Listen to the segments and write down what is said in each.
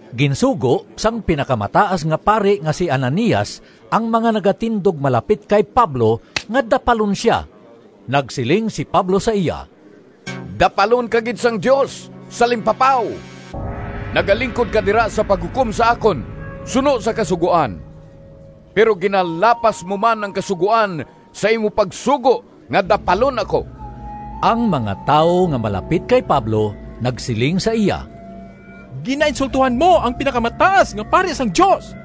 Ginsugo sang Pinakamataas nga Pari nga si Ananias ang mga nagatindog malapit kay Pablo nga dapalon sia. Nagsiling si Pablo sa iya, “Dapalon ka gid sang Dios, salimpapaw! Nagalingkod ka dira sa paghukom sa akon suno sa Kasugoan, pero ginalapas mo man ang Kasugoan sa imo pagsugo nga dapalon ako!” Ang mga tawo nga malapit kay Pablo nagsiling sa iya, “Ginainsultohan mo ang Pinakamataas nga Pari sang Dios!”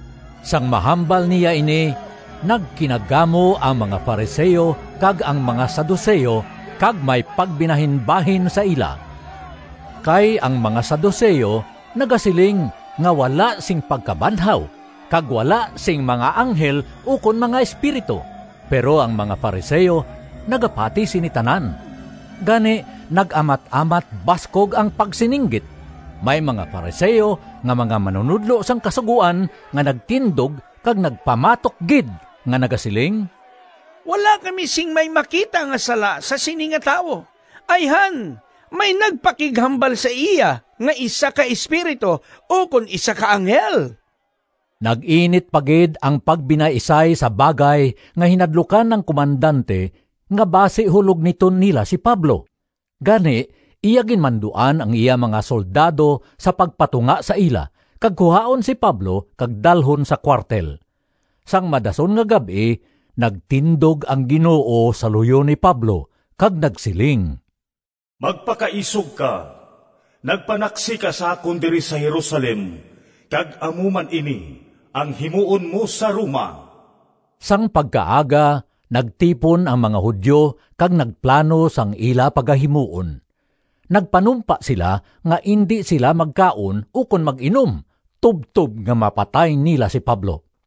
Sang mahambal niya ini, nagkinagamo ang mga Fariseo kag ang mga Saduceo, kag may pagbinahin-bahin sa ila. (Kay ang mga Saduceo nagasiling nga wala sing pagkabanhaw, kag wala sing mga anghel ukon mga espiritu, pero ang mga Fariseo nagapati sini tanan.) Gani nag-amat-amat baskog ang pagsininggit. May mga Fariseo nga mga manunodlo sang Kasugoan nga nagtindog kag nagpamatok gid nga nagasiling, “Wala kami sing may makita nga sala sa sini nga tawo! Ayhan may nagpakighambal sa iya nga isa ka espiritu ukon isa ka anghel!” Nag-init pa gid ang pagbinaisay sa bagay nga hinadlukan ang komandante nga basi hulogniton nila si Pablo. Gani iya ginmanduan ang iya mga soldado sa pagpatunga sa ila, kag kuhaon si Pablo kag dalhon sa kuwartel. Sang madason nga gab-i nagtindog ang Ginoo sa luyo ni Pablo kag nagsiling, “Magpakaisog ka! Nagpanaksi ka sa akon diri sa Jerusalem, kag amo man ini ang himuon mo sa Roma.” Sang pagkaaga, nagtipon ang mga Judio kag nagplano sang ila pagahimuon. Nagpanumpa sila nga indi sila magkaon ukon mag-inom tubtob nga mapatay nila si Pablo.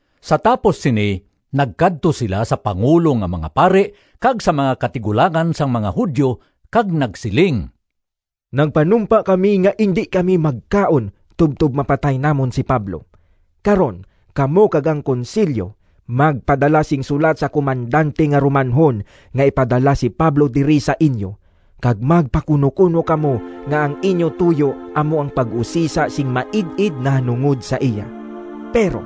Sa tapos sini nagkadto sila sa pangulo nga mga pari kag sa mga katigulangan sang mga Judio kag nagsiling, “Nagpanumpa kami nga indi kami magkaon tubtob mapatay namon si Pablo. Karon kamo kag ang Konsilyo magpadala sing sulat sa komandante nga Romanhon nga ipadala si Pablo diri sa inyo, kag magpakunokuno kamo nga ang inyo tuyo amo ang pag-usisa sing maid-id nahanungod sa iya. Pero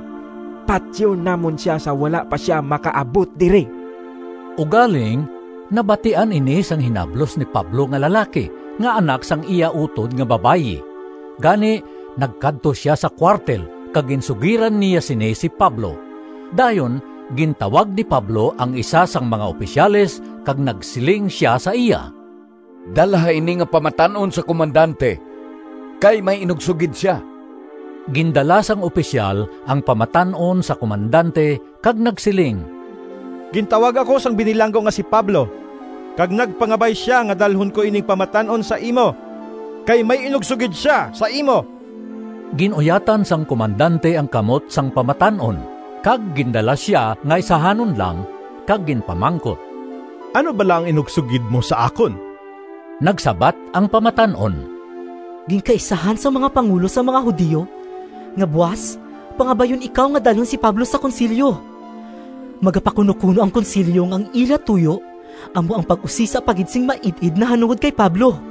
patyon namon sia sa wala pa sia makaabot diri.” Ugaling nabatian ini sang hinablos ni Pablo nga lalaki, nga anak sang iya utod nga babayi. Gani nagkadto sia sa kuwartel kag ginsugiran niya sini si Pablo. Dayon gintawag ni Pablo ang isa sang mga opisyales kag nagsiling sia sa iya, “Dalha ini nga pamatan-on sa komandante, kay may inugsugid sia.” Gindala sang opisyal ang pamatan-on sa komandante kag nagsiling, “Gintawag ako sang binilanggo nga si Pablo kag nagpangabay sia nga dalhon ko ining pamatan-on sa imo, kay may inugsugid sia sa imo.” Gin-uyatan sang komandante ang kamot sang pamatan-on kag gindala sia nga isahanon lang kag ginpamangkot, “Ano bala ang inugsugid mo sa akon?” Nagsabat ang pamatan-on, “Ginkaisahan sang mga pangulo sang mga Judio nga buas pangabayon ikaw nga dalhon si Pablo sa Konsilyo. Magapakunokuno ang Konsilyo nga ang ila tuyo amo ang pag-usisa pa gid sing maid-id nahanungod kay Pablo.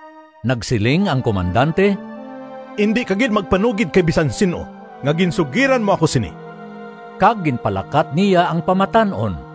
Nagsiling ang komandante, “Indi ka gid magpanugid kay bisan sin-o nga ginsugiran mo ako sini.” Kag ginpalakat niya ang pamatan-on.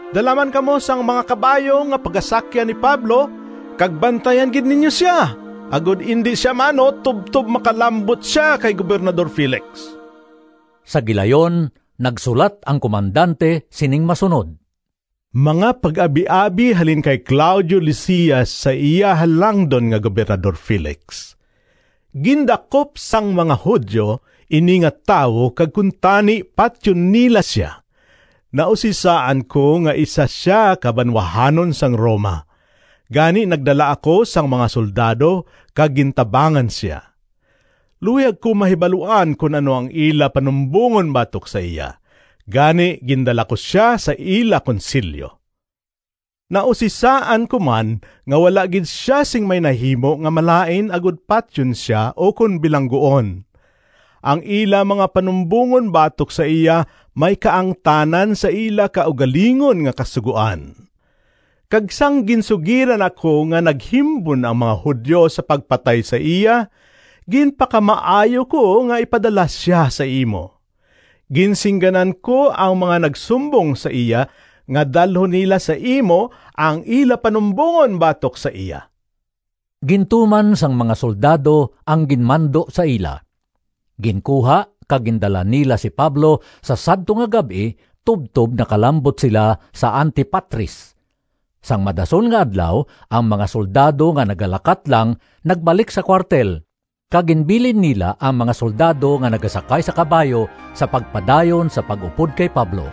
Dala man kamo sang mga kabayo nga pagasakyan ni Pablo kag bantayan gid ninyo sia, agod indi sia maano tubtob makalambot sia kay Gobernador Felix.” Sa gilayon nagsulat ang komandante sining masunod: “Mga pag-abiabi halin kay Claudio Lisias sa iya Halangdon nga Gobernador Felix. Gindakop sang mga Judio ini nga tawo kag kuntani patyon nila sia. Nausisaan ko nga isa sia ka banwahanon sang Roma, gani nagdala ako sang mga soldado kag gintabangan sia. Luyag ko mahibaluan kon ano ang ila panumbongon batok sa iya, gani gindala ko sia sa ila Konsilyo. Nausisaan ko man nga wala gid sia sing may nahimo nga malain agod patyon sia ukon bilangguon. Ang ila mga panumbongon batok sa iya may kaangtanan sa ila kaugalingon nga kasugoan. Kag sang ginsugiran ako nga naghimbon ang mga Judio sa pagpatay sa iya, ginpakamaayo ko nga ipadala sia sa imo. Ginsingganan ko ang mga nagsumbong sa iya nga dalhon nila sa imo ang ila panumbongon batok sa iya.” Gintuman sang mga soldado ang ginmando sa ila. Ginkuha kag gindala nila si Pablo sa sadto nga gab-i tubtob nakalambot sila sa Antipatris. Sang madason nga adlaw ang mga soldado nga nagalakat lang nagbalik sa kuwartel, kag ginbilin nila ang mga soldado nga nagasakay sa kabayo sa pagpadayon sa pag-upod kay Pablo.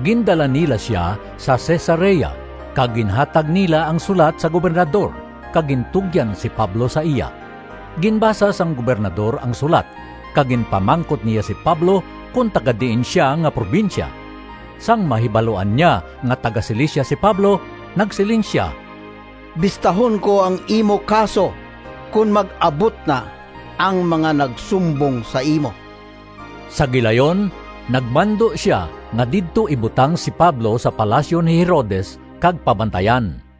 Gindala nila sia sa Cesarea kag ginhatag nila ang sulat sa Gobernador kag gintugyan si Pablo sa iya. Ginbasa sang Gobernador ang sulat kag ginpamangkot niya si Pablo kon taga-diin sia nga probinsya. Sang mahibaluan niya nga taga-Cilicia si Pablo, nagsiling sia, “Bistahon ko ang imo kaso kon mag-abot na ang mga nagsumbong sa imo.” Sa gilayon nagmando sia nga didto ibutang si Pablo sa palasyo ni Herodes kag pabantayan.